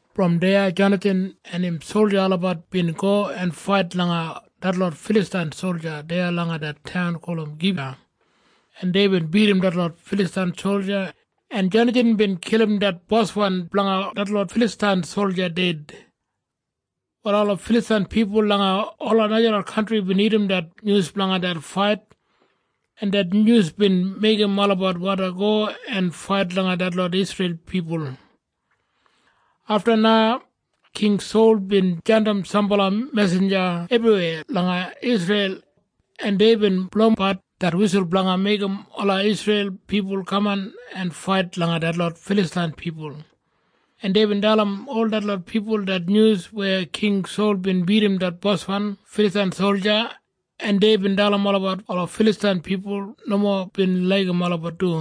Brom deya Jonathan en im solja olabat bin go en fait langa detlot Filastain solja deya langa det taun gulum Geba, en deibin bidim detlot Filastain solja, en Jonathan bin kilim det boswan blanga detlot Filastain solja ded. Wal ola Filastain pipul langa ola najalot kantri bin irrim det nyus blanga det fait, en det nyus bin meigim olabat wandi go en fait langa detlot Isreil pipul. Afta na King Sol bin jandim sambala mesinja ebriweya langa Isreil, en deibin blowimbat det wisul blanga meigim ola Isreil pipul kaman en fait langa detlot Filastain pipul, en deibin dalim ol detlot pipul det nyus weya King Sol bin bidim det boswan Filastain solja, en deibin dalim olabat ola Filastain pipul nomo bin laigim olabat du.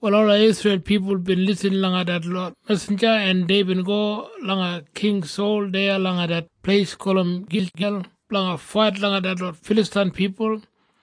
Wal ola Isreil pipul bin lisin langa detlot mesinja, en deibin go langa King Sol deya langa det pleis gulum Gilgel blanga fait langa detlot Filastain pipul.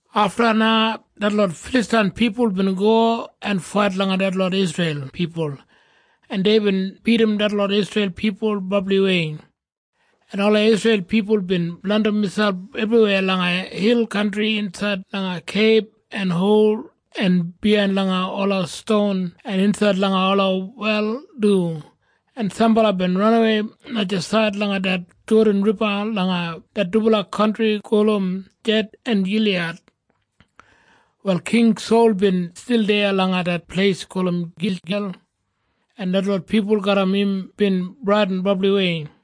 Afta na detlot Filastain pipul bin go en fait langa detlot Isreil pipul, en deibin bidim detlot Isreil pipul brabliwei, en ola Isreil pipul bin blandim miselp ebriweya langa hil kantri insaid langa keib en hol en biyain langa ola ston en insaid langa ola wel du, en sambala bin ranawei najasaid langa det Jodan Riba langa det dubala kantri gulum Ged en Giliyad. Wal King Sol bin stil deya langa det pleis gulum Gilgel, en detlot pipul garram im bin bradin brabliwei.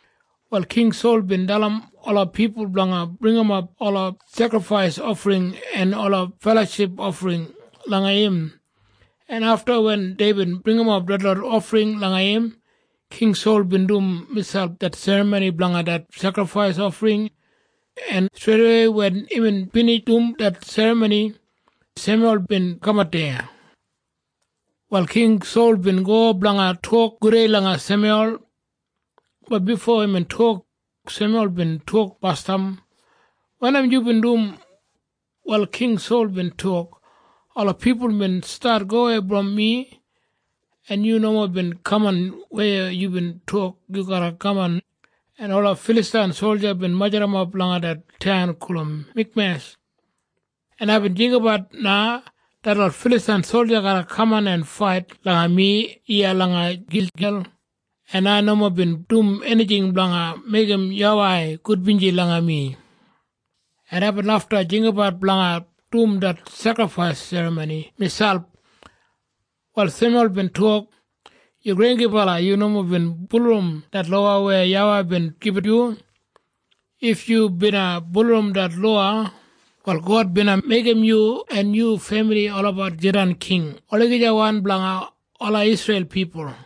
Wal King Sol bin dalim ola pipul blanga bringimap ola sekrifais ofring en ola feloship ofring langa im, en afta wen deibin bringimap detlot ofring langa im, King Sol bin dum miselp det serramoni blanga det sekrifais ofring, en streidawei wen imbin binij dum det serramoni, Semyul bin kamat deya. Wal King Sol bin go blanga tok gudei langa Semyul. Bat bifo imbin tok, Semyul bin tok basdam, “Wanim yubin dum?” Wal King Sol bin tok, “Ola pipul bin stat gowei brom mi, en yu nomo bin kaman weya yubin tok yu garra kaman, en ola Filastain solja bin majurrap langa det taun gulum Mikmesh, en aibin jinggabat na detlot Filastain solja garra kaman en fait langa mi iya langa Gilgel, en ai nomo bin dum enijing blanga meigim YAWEI gudbinji langa mi, en aibin lafta jinggabat blanga dum det sekrifais serramoni miselp.” Wal Semyul bin tok, “Yu granggibala! Yu nomo bin bulurrum det lowa weya YAWEI bin gibit yu. If yu bina bulurrum det lowa, wal God bina meigim yu en yu femili olabat jidan king olagijawan blanga ola Isreil pipul.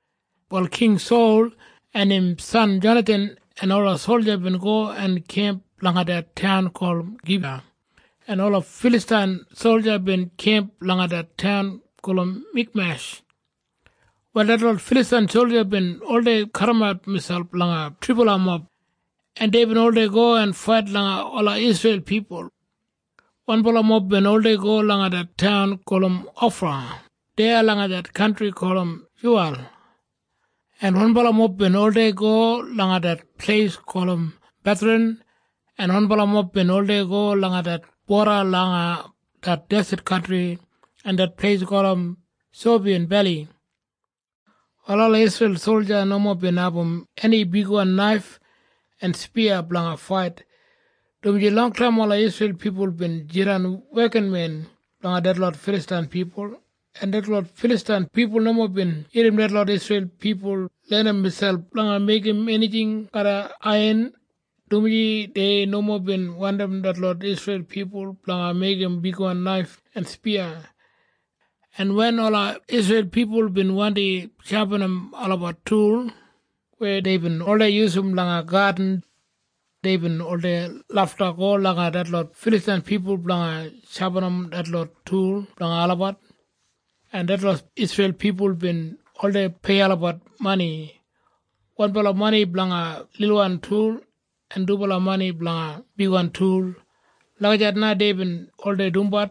Wal King Sol en im san Jonathan en ola solja bin go en kemp langa det taun gulum Geba, en ola Filastain solja bin kemp langa det taun gulum Mikmesh. Wal detlot Filastain solja bin oldei kadimat miselp langa thribala mob, en deibin oldei go en fait langa ola Isreil pipul. Wanbala mob bin oldei go langa det taun gulum Ofra deya langa det kantri gulum Shuwal, en wanbala mob bin oldei go langa det pleis gulum Betharan, en wanbala mob bin oldei go langa det boda blanga det deset kantri en det pleis gulum Seboyim Beli. Wal ola Isreil solja nomo bin abum eni bigwan naif en spiya blanga fait, dumaji longtaim ola Isreil pipul bin jidan wekinmen blanga detlot Filastain pipul, en detlot Filastain pipul nomo bin larram detlot Isreil pipul lenim miselp blanga meigim enijing garram aiyan, dumaji dei nomo bin wandim detlot Isreil pipul blanga meigim bigwan naif en spiya. En wen ola Isreil pipul bin wandi shapinim olabat tul weya deibin oldei yusum langa gadin, deibin oldei lafta go langa detlot Filastain pipul blanga shapinim detlot tul blanga olabat, en detlot Isreil pipul bin oldei pei olabat mani, wanbala mani blanga lilwan tul en dubala mani blanga bigwan tul. Lagijat na deibin oldei dumbat,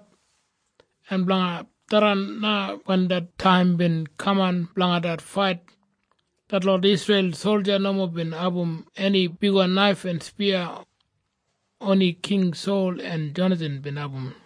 en blanga tharran na wen det taim bin kaman blanga det fait, detlot Isreil solja nomo bin abum eni bigwan naif en spiya. Oni King Sol en Jonathan bin abum.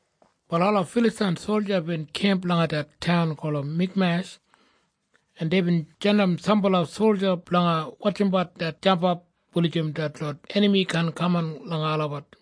Wal ola Filastain solja bin kemp langa det taun gulum Mikmesh, en deibin jandim sambala solja blanga wotjimbat det jampap wulijim detlot enami kaan kaman langa olabat.